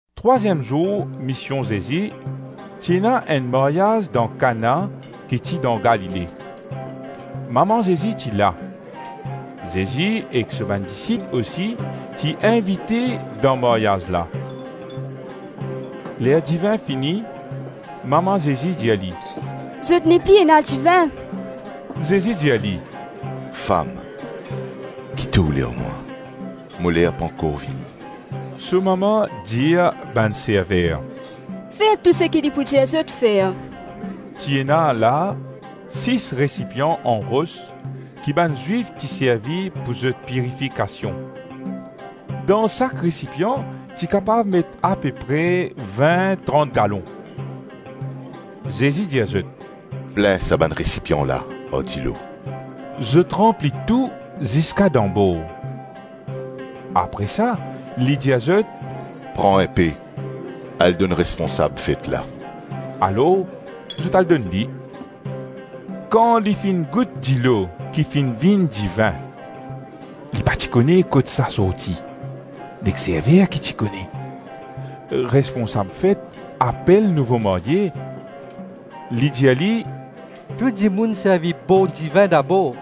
Trwaziem zour mision Zezi, ti ena enn maryaz dan Kana ki ti dan Galile. Mama Zezi ti la. Zezi ek so bann disip osi ti invite dan maryaz la. Ler divin fini, mama Zezi dir li, “Zot nepli ena divin.” Zezi dir li, “Fam, ki to oule ar mwa? Mo ler pankor vini.” So mama dir bann server, “Fer tou seki li pou dir zot fer.” Ti ena la, sis resipian an ros ki bann Zwif ti servi pou zot pirifikasion. Dan sak resipian ti kapav met ape pre vin-trant galon. Zezi dir zot, “Plin sa bann resipian la ar dilo.” Zot ranpli tou ziska dan bor. Apre sa li dir zot, “Pran inpe, al donn responsab fet la.” Alors zot al donn li. Kan li finn gout dilo ki finn vinn divin, (li pa ti kone kot sa sorti; nek server ki ti kone), responsab fet apel nouvo marye. Li dir li, “Tou dimoun servi bon divin dabor,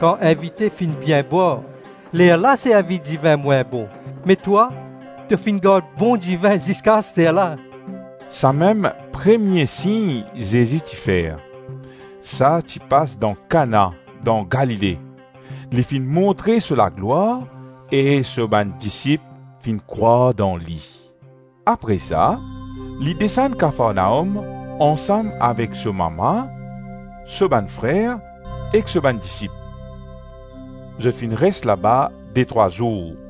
kan invite finn bien bwar, lerla servi divin mwin bon; me twa, to finn gard bon divin ziska asterla.” Samem premie sign Zezi ti fer. Sa ti pas dan Kana dan Galile; li finn montre so laglwar e so bann disip finn krwar dan li. Apre sa, li desann Kafarnaom ansam avek so mama, so bann frer ek so bann disip. Zot finn res laba detrwa zour.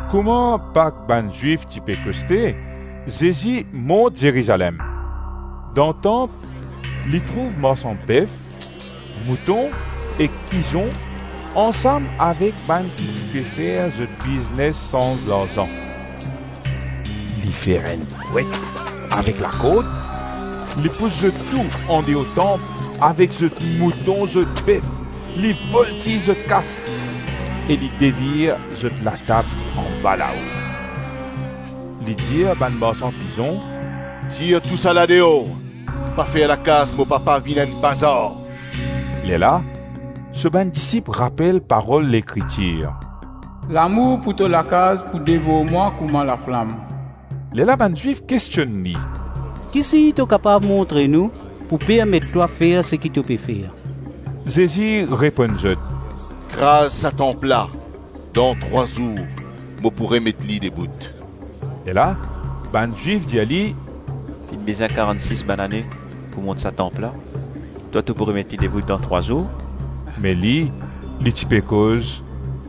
Kouma Pak bann Zwif ti pe koste, Zezi mont Zerizalem. Dan tanp, li trouv marsan bef, mouton ek pizon ansam avek bann ki ti pe fer zot biznes sanz larzan. Li fer enn fwet avek lakord, li pous zot tou andeor tanp avek zot mouton, zot bef, li voltiz zot kas e li devir zot latab anbalao. Li dir bann marsan pizon, “Tir tousala deor; pa fer lakaz mo papa vinn enn bazar.” Lerla so bann disip rapel parol Lekritir, ‘Lamour pou to lakaz pou devor mwa kouma laflam.’ Lerla bann Zwif kestionn li, “Ki sign to kapav montre nou, pou permet twa fer seki to pe fer?” Zezi reponn zot, “Kraz sa tanp la, dan trwa zour mo pou remet li debout.” Lerla bann Zwif dir li, “Finn bizin karann-sis banane pou mont sa tanp la, twa, to pou remet li debout dan trwa zour?” Me li, li ti pe koz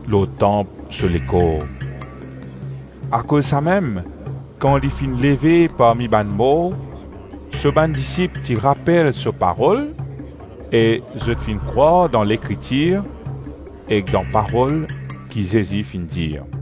lor tanp so lekor. Akoz samem, kan li finn leve parmi bann mor, so bann disip ti rapel so parol e zot finn krwar dan Lekritir ek dan Parol ki Zezi finn dir.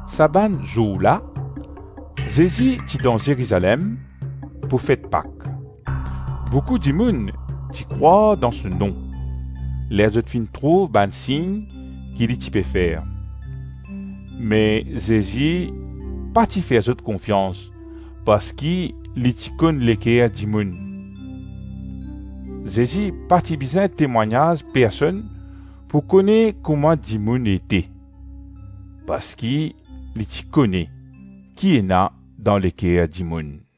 Sa bann zour la, Zezi ti dan Zerizalem pou fet Pak. Boukou dimoun ti krwar dan so nom, ler zot finn trouv bann sign ki li ti pe fer. Me Zezi pa ti fer zot konfians parski li ti konn leker dimoun. Zezi pa ti bizin temwagnaz personn pou kone kouma dimoun ete, parski li ti kone ki ena dan leker dimoun.